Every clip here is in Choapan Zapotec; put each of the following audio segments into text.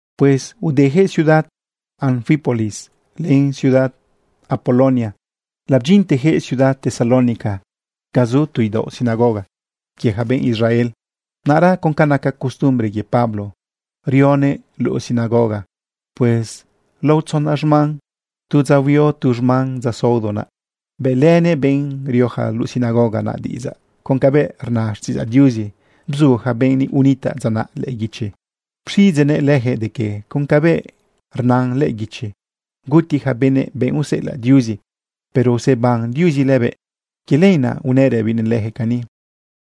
Pues udeyaquëꞌ ciudad Anfípolis len ciudad Apolonia labdyintejëꞌ ciudad Tesalónica ga zu tu idaoꞌ sinagoga quie ja benꞌ Israel. Naꞌra con ca naca costumbre quie Pablo, rionëꞌ luꞌu sinagoga. Pues lao tzona xman, tu dza huio tu xman dza saodo naꞌ, bëꞌlënëꞌ benꞌ rioja luꞌu sinagoga naꞌ diꞌidzaꞌ con cabëꞌ rna xtiꞌidzaꞌ Diuzi bzu ja benꞌ unitaꞌ dza naꞌ lëꞌë guichi. Pxiꞌidzeꞌnëꞌ leyaquëꞌ de que con cabëꞌ rna lëꞌë guichi guti yaca benëꞌ benꞌ useꞌelaꞌ Diuzi, pero useban Diuzi lëbëꞌ. Quie lenaꞌ unëꞌ rëbinëꞌ lejëꞌ cani: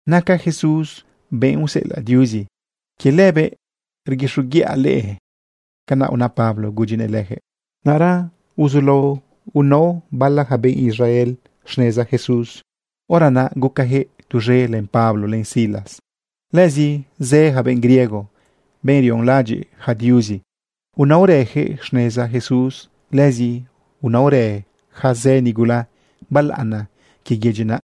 ―Naca Jesús benꞌ useꞌelaꞌ Diuzi. Quie lëbëꞌ rguixoguiꞌa leꞌe. ―Canaꞌ una Pablo gudyinëꞌ lejëꞌ. Naꞌra uzulao inao bala yaca benꞌ Israel xneza Jesús. Hora naꞌ gucajëꞌ tuz̃e len Pablo len Silas. Lëzi zë yaca benꞌ griego, benꞌ rionlaꞌadyiꞌ yaca diuzi, unaorëyaquëꞌ xneza Jesús. Lëzi unaorë ja zë nigula balaꞌana quie yedyi naꞌ.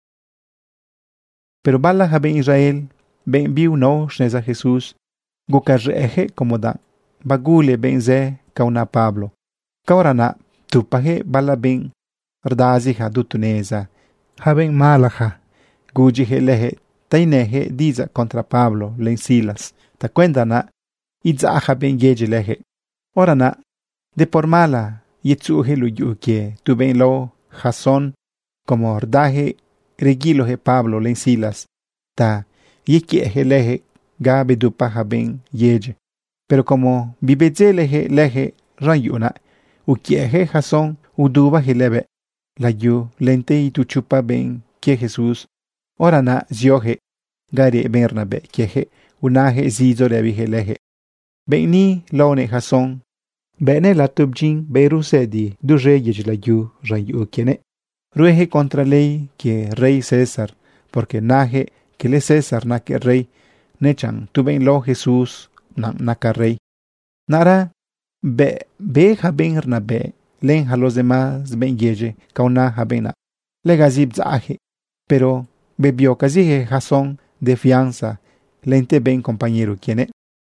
Pero bala ja benꞌ Israel, benꞌ biunao xneza Jesús, gucaz̃ëꞌëyaquëꞌ como danꞌ bagule benꞌ zë ca una Pablo. Caora naꞌ ptupajëꞌ bala benꞌ rdazija du tu neza, yaca benꞌ malaja, gudyiyaquëꞌ leyaquëꞌ ta inëyaquëꞌ diꞌidzaꞌ contra Pablo len Silas tacuenda naꞌ idzaꞌ yaca benꞌ yedyi leyaquëꞌ. Hora naꞌ de por mala yetzuꞌuyaquëꞌ luꞌu yuꞌu quie tu benꞌ lao Jasón como rdayaquëꞌ reguiloyaquëꞌ Pablo len Silas ta yequiëꞌyaquëꞌ lejëꞌ ga bedupa ja benꞌ yedyi. Pero como bibedzeleyaquëꞌ lejëꞌ z̃an yuꞌu naꞌ, uquiëꞌyaquëꞌ Jasón udubayaquëꞌ lëbëꞌ layu lente itu chopa benꞌ quie Jesús. Hora naꞌ zioyaquëꞌ ga reꞌ benꞌ rnabëꞌ quiejëꞌ unayaquëꞌ zidzo rëbiyaquëꞌ leyaquëꞌ: ―Benꞌ ni laonëꞌ Jasón. Bëꞌnëꞌ lato bdyin benꞌ rue zëdi duz̃e yedyi layu z̃an yuꞌu quienëꞌ. Rueyaquëꞌ contra ley quie rey César, porque nayaquëꞌ quele César naquëꞌ rey, nechanꞌ tu benꞌ lao Jesús naꞌ naca rey. Naꞌra bëꞌ be ja benꞌ rnabëꞌ len yaca los demás benꞌ yedyi ca una yaca benꞌ naꞌ, legazi bdzaꞌyaquëꞌ. Pero bebiocaziyaquëꞌ Jasón de fianza lente benꞌ compañero quienëꞌ.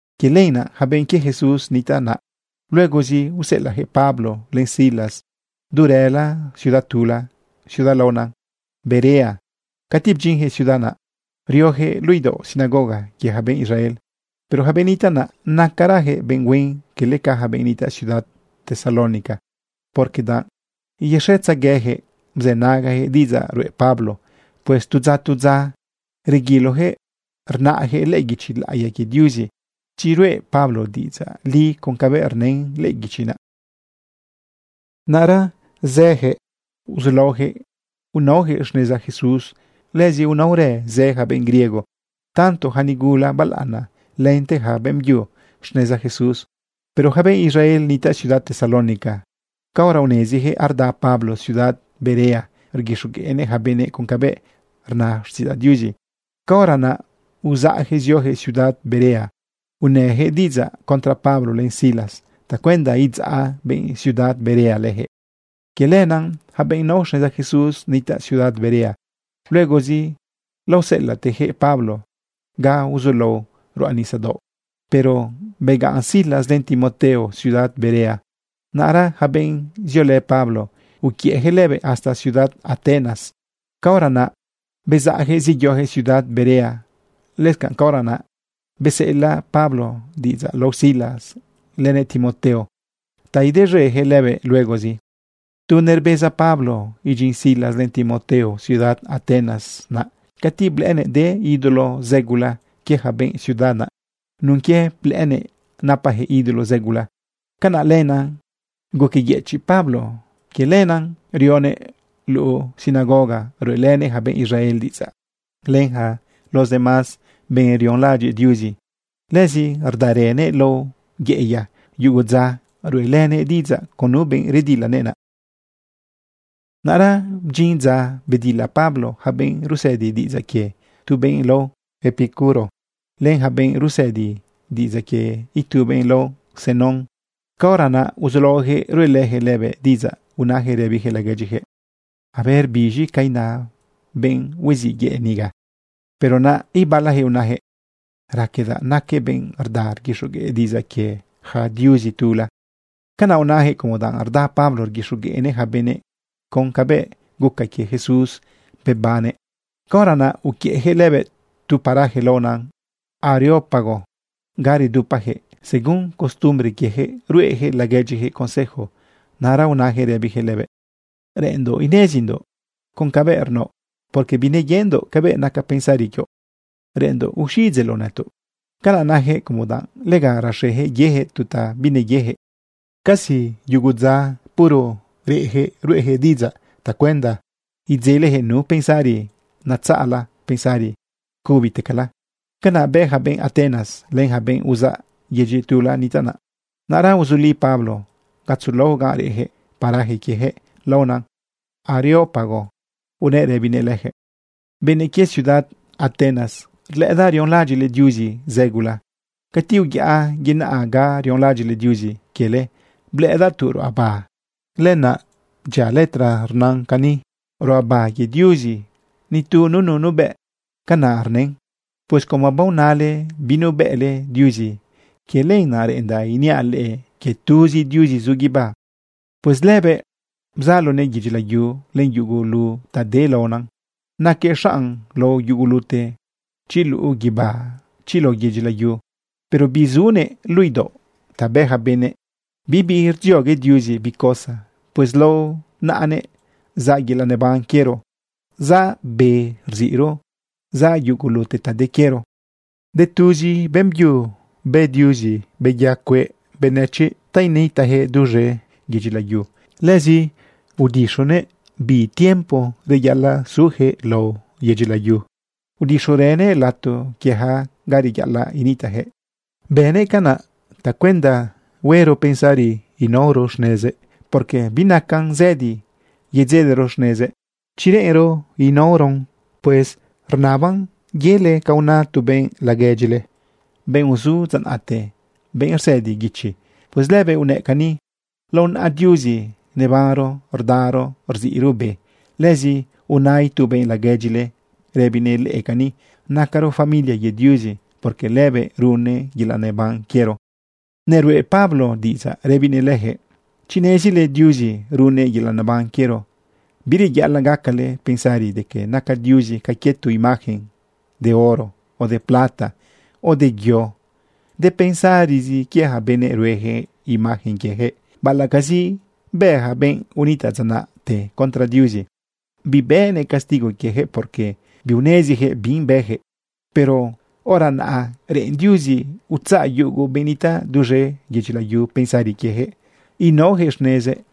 Quie lenaꞌ ja benꞌ quie Jesús nitaꞌ naꞌ luegozi useꞌelaꞌyaquëꞌ Pablo len Silas du rëla ciudad tula, ciudad laona Berea. Cati bdyinyaquëꞌ ciudad naꞌ, rioyaquëꞌ luꞌu idaoꞌ sinagoga quie ja benꞌ Israel. Pero yaca benꞌ nitaꞌ naꞌ, nacarajëꞌ benꞌ huen, quele ca yaca benꞌ nitaꞌ ciudad Tesalónica, porque danꞌ yexetzegueyaquëꞌ bzënagayaquëꞌ diꞌidzaꞌ ruꞌe Pablo. Pues tu dza, tu dza, reguiloyaquëꞌ rnaꞌyaquëꞌ lëꞌë guichi laꞌiya quie Diuzi chi ruꞌe Pablo diꞌidzaꞌ li con cabëꞌ rnën lëꞌë guichi naꞌ. Naꞌra zëyaquëꞌ uzulaoyaquëꞌ inaoyaquëꞌ xneza Jesús. Lëzi unaorë zë ja benꞌ griego, tanto yaca nigula balaꞌana lente yaca beꞌmbyu, xneza Jesús. Pero yaca benꞌ Israel nitaꞌ ciudad Tesalónica, caora uneziyaquëꞌ arda Pablo ciudad Berea rguixogueꞌnëꞌ yaca benëꞌ con cabëꞌ rna xtiꞌidzaꞌ Diuzi, caora naꞌ uzaꞌyaquëꞌ zioyaquëꞌ ciudad Berea unëyaquëꞌ diꞌidzaꞌ contra Pablo len Silas tacuenda idzaꞌ benꞌ ciudad Berea lejëꞌ. Quie lenaꞌ ja benꞌ nao xneza Jesús nitaꞌ ciudad Berea, luegozi laoseꞌelaꞌteyaquëꞌ Pablo ga uzulao ruꞌa nisadaoꞌ. Pero begaꞌn Silas len Timoteo ciudad Berea. Naꞌra yaca benꞌ ziolë Pablo, uquiëꞌyaquëꞌ lëbëꞌ hasta ciudad Atenas. Caora naꞌ bezaꞌyaquëꞌ zeyoyaquëꞌ ciudad Berea. Lëscanꞌ caora naꞌ beseꞌelaꞌ Pablo diꞌidzaꞌ lao Silas lenëꞌ Timoteo ta idez̃eyaquëꞌ lëbëꞌ luegozi. Tu nerbeza Pablo idyin Silas len Timoteo ciudad Atenas naꞌ, cati blëꞌënëꞌ de ídolo zë gula quie ja benꞌ ciudad naꞌ. Nun quie blëꞌënëꞌ napayaquëꞌ ídolo zëgula, canaꞌ lenaꞌ guqueyëchiꞌ Pablo. Quie lenaꞌ rionëꞌ luꞌu sinagoga ruꞌelënëꞌ yaca benꞌ Israel diꞌidzaꞌ len yaca los demás benꞌ rionlaꞌadyiꞌ Diuzi. Lëzi rdarënëꞌ lao yeꞌeya yugo dza ruꞌelënëꞌ diꞌidzaꞌ con nu benꞌ redilanëꞌ naꞌ. Naꞌra bdyin dza bedila Pablo yaca benꞌ rusëdi diꞌidzaꞌ quie tu benꞌ lao Epicuro, len yaca benꞌ rusëdi diꞌidzaꞌ quie itu benꞌ lao Zenón. Caora naꞌ uzulaoyaquëꞌ ruꞌelëyaquëꞌ lëbëꞌ diꞌidzaꞌ. Unayaquëꞌ rëbiyaquëꞌ laguedyiyaquëꞌ: ―¿A ver biz̃i ca ina benꞌ hueziꞌ yëꞌ niga? Pero naꞌ ibalayaquëꞌ unayaquëꞌ: ―Raquedaꞌ naquëꞌ benꞌ rda rguixogueꞌ diꞌidzaꞌ quie yaca diuzi tula. Canaꞌ unayaquëꞌ como danꞌ rda Pablo rguixogueꞌnëꞌ yaca benëꞌ con cabëꞌ guca quie Jesús bebannëꞌ. Caora naꞌ uquiëꞌyaquëꞌ lëbëꞌ tu paraje laona Areópago ga redupayaquëꞌ según costumbre quiejëꞌ ruꞌeyaquëꞌ laguedyijëꞌ consejo. Naꞌra unayaquëꞌ rëbiyaquëꞌ lëbëꞌ: ―Reꞌenndoꞌ inezindoꞌ con cabëꞌ rnaoꞌ, porque bineyendoꞌ cabëꞌ naca pensari quioꞌ. Reꞌenndoꞌ uxiꞌidzeꞌloꞌ nëtoꞌ. Canaꞌ nayaquëꞌ como danꞌ lega rexeyaquëꞌ yeyaquëꞌ tu ta bineyeyaquëꞌ. Casi yugu dza puro reꞌyaquëꞌ ruꞌeyaquëꞌ diꞌidzaꞌ tacuenda idzeleyaquëꞌ nu pensari natzaꞌla, pensari cubitecala. Canaꞌ bë ja benꞌ Atenas len ja benꞌ uzaꞌ yedyi tula nitaꞌ naꞌ. Naꞌra uzuli Pablo gatzo laꞌo gan reꞌjëꞌ paraje quiejëꞌ laona Areópago unëꞌ rëbinëꞌ leyaquëꞌ: ―Benëꞌ quie ciudad Atenas, rlëꞌëdaꞌ rionlaꞌadyiꞌle diuzi zë gula. Cati uyaꞌa yenaꞌa ga rionlaꞌadyiꞌle diuzi quiele, blëꞌëdaꞌ tu ruꞌaba lëꞌëna naꞌ dyia letra rnan cani: “Ruꞌaba quie diuzi nitu nunu nubëꞌ.” Canaꞌ rnën. Pues como baonale binubëꞌle Diuzi, quie lenaꞌ reꞌendaꞌ iniaꞌ leꞌe quie tuzi Diuzi zu guibá. ’Pues lëbëꞌ bzalonëꞌ yedyi layu len yugulu ta de laona. Naquëꞌ xanꞌ lao yugulute, chi luꞌu guibá, chi lao yedyi layu. Pero bizunëꞌ luꞌu idaoꞌ ta bë ja benëꞌ. Bibi rdziogue Diuzi bi cosa. Pues lao naꞌanëꞌ zaꞌ yelaꞌ neban quiero, zaꞌ be rziꞌro, zaꞌ yugulu ta de quiero. ’De tuzi beꞌmbyu bë Diuzi beya cueꞌ benëchiꞌ ta initaꞌyaquëꞌ duz̃e yedyi layu. Lëzi udixunëꞌ bi tiempo reyaꞌalaꞌ zuyaquëꞌ lao yedyi layu, udixurënëꞌ lato quieyaquëꞌ ga reyaꞌalaꞌ nitaꞌyaquëꞌ. Bënëꞌ canaꞌ tacuenda huero pensari inaoro xnezëꞌ, porque binacan zëdi yedzelero xnezëꞌ chi reꞌenro inaoron. Pues rnaban yele ca una tu benꞌ laguedyile, benꞌ uzu dza naꞌte, benꞌ rsëdi guichi. Pues lëbëꞌ unëꞌ cani: “Lao naꞌa Diuzi nebanro, rdaro, rziꞌro be.” Lëzi una itu benꞌ laguedyile rëbinëꞌ leꞌe cani: “Nacaro familia quie Diuzi, porque lëbëꞌ runnëꞌ yelaꞌ neban quiero.” Neruꞌe Pablo diꞌidzaꞌ rëbinëꞌ leyaquëꞌ: ―Chi nezile Diuzi runnëꞌ yelaꞌ neban quiero, bireyaꞌalaꞌ gacale pensari de que naca Diuzi ca quie tu imagen de oro o de plata, o de yo. De pensarizi quie yaca benëꞌ rueyaquëꞌ imagen quieyaquëꞌ. Baꞌalaꞌcazi bë ja benꞌ unitaꞌ dza naꞌte contra Diuzi, bibënëꞌ castigo quieyaquëꞌ, porque biuneziyaquëꞌ bi bëyaquëꞌ. Pero hora naꞌ reꞌen Diuzi utzaꞌ yugo benꞌ nitaꞌ duz̃e yedyi layu pensari quieyaquëꞌ inaoyaquëꞌ xnezëꞌ.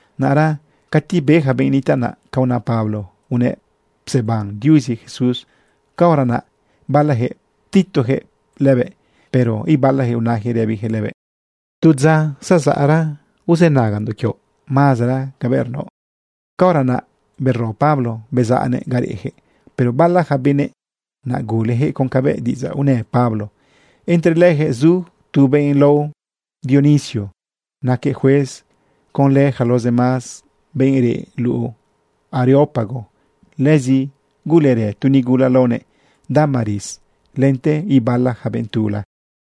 Naꞌra cati be yaca benꞌ nitaꞌ naꞌ ca una Pablo unëꞌ pseban Diuzi Jesús, caora naꞌ balayaquëꞌ ptitojëꞌ lëbëꞌ. Pero ibalayaquëꞌ unayaquëꞌ rëbiyaquëꞌ lëbëꞌ: ―Tu dza zezaꞌra uzënagandoꞌ quioꞌ mazera cabëꞌ rnaoꞌ. Caora naꞌ bero Pablo bezaꞌnëꞌ ga reꞌyaquëꞌ, pero bala yaca benëꞌ naꞌ guleyaquëꞌ con cabëꞌ diꞌidzaꞌ unë Pablo. Entre leyaquëꞌ zu tu benꞌ lao Dionisio, naquëꞌ juez conlë yaca los demás benꞌ reꞌ luꞌu Areópago. Lëzi gulerë tu nigula laonëꞌ Dámaris lente ibala ja benꞌ tula.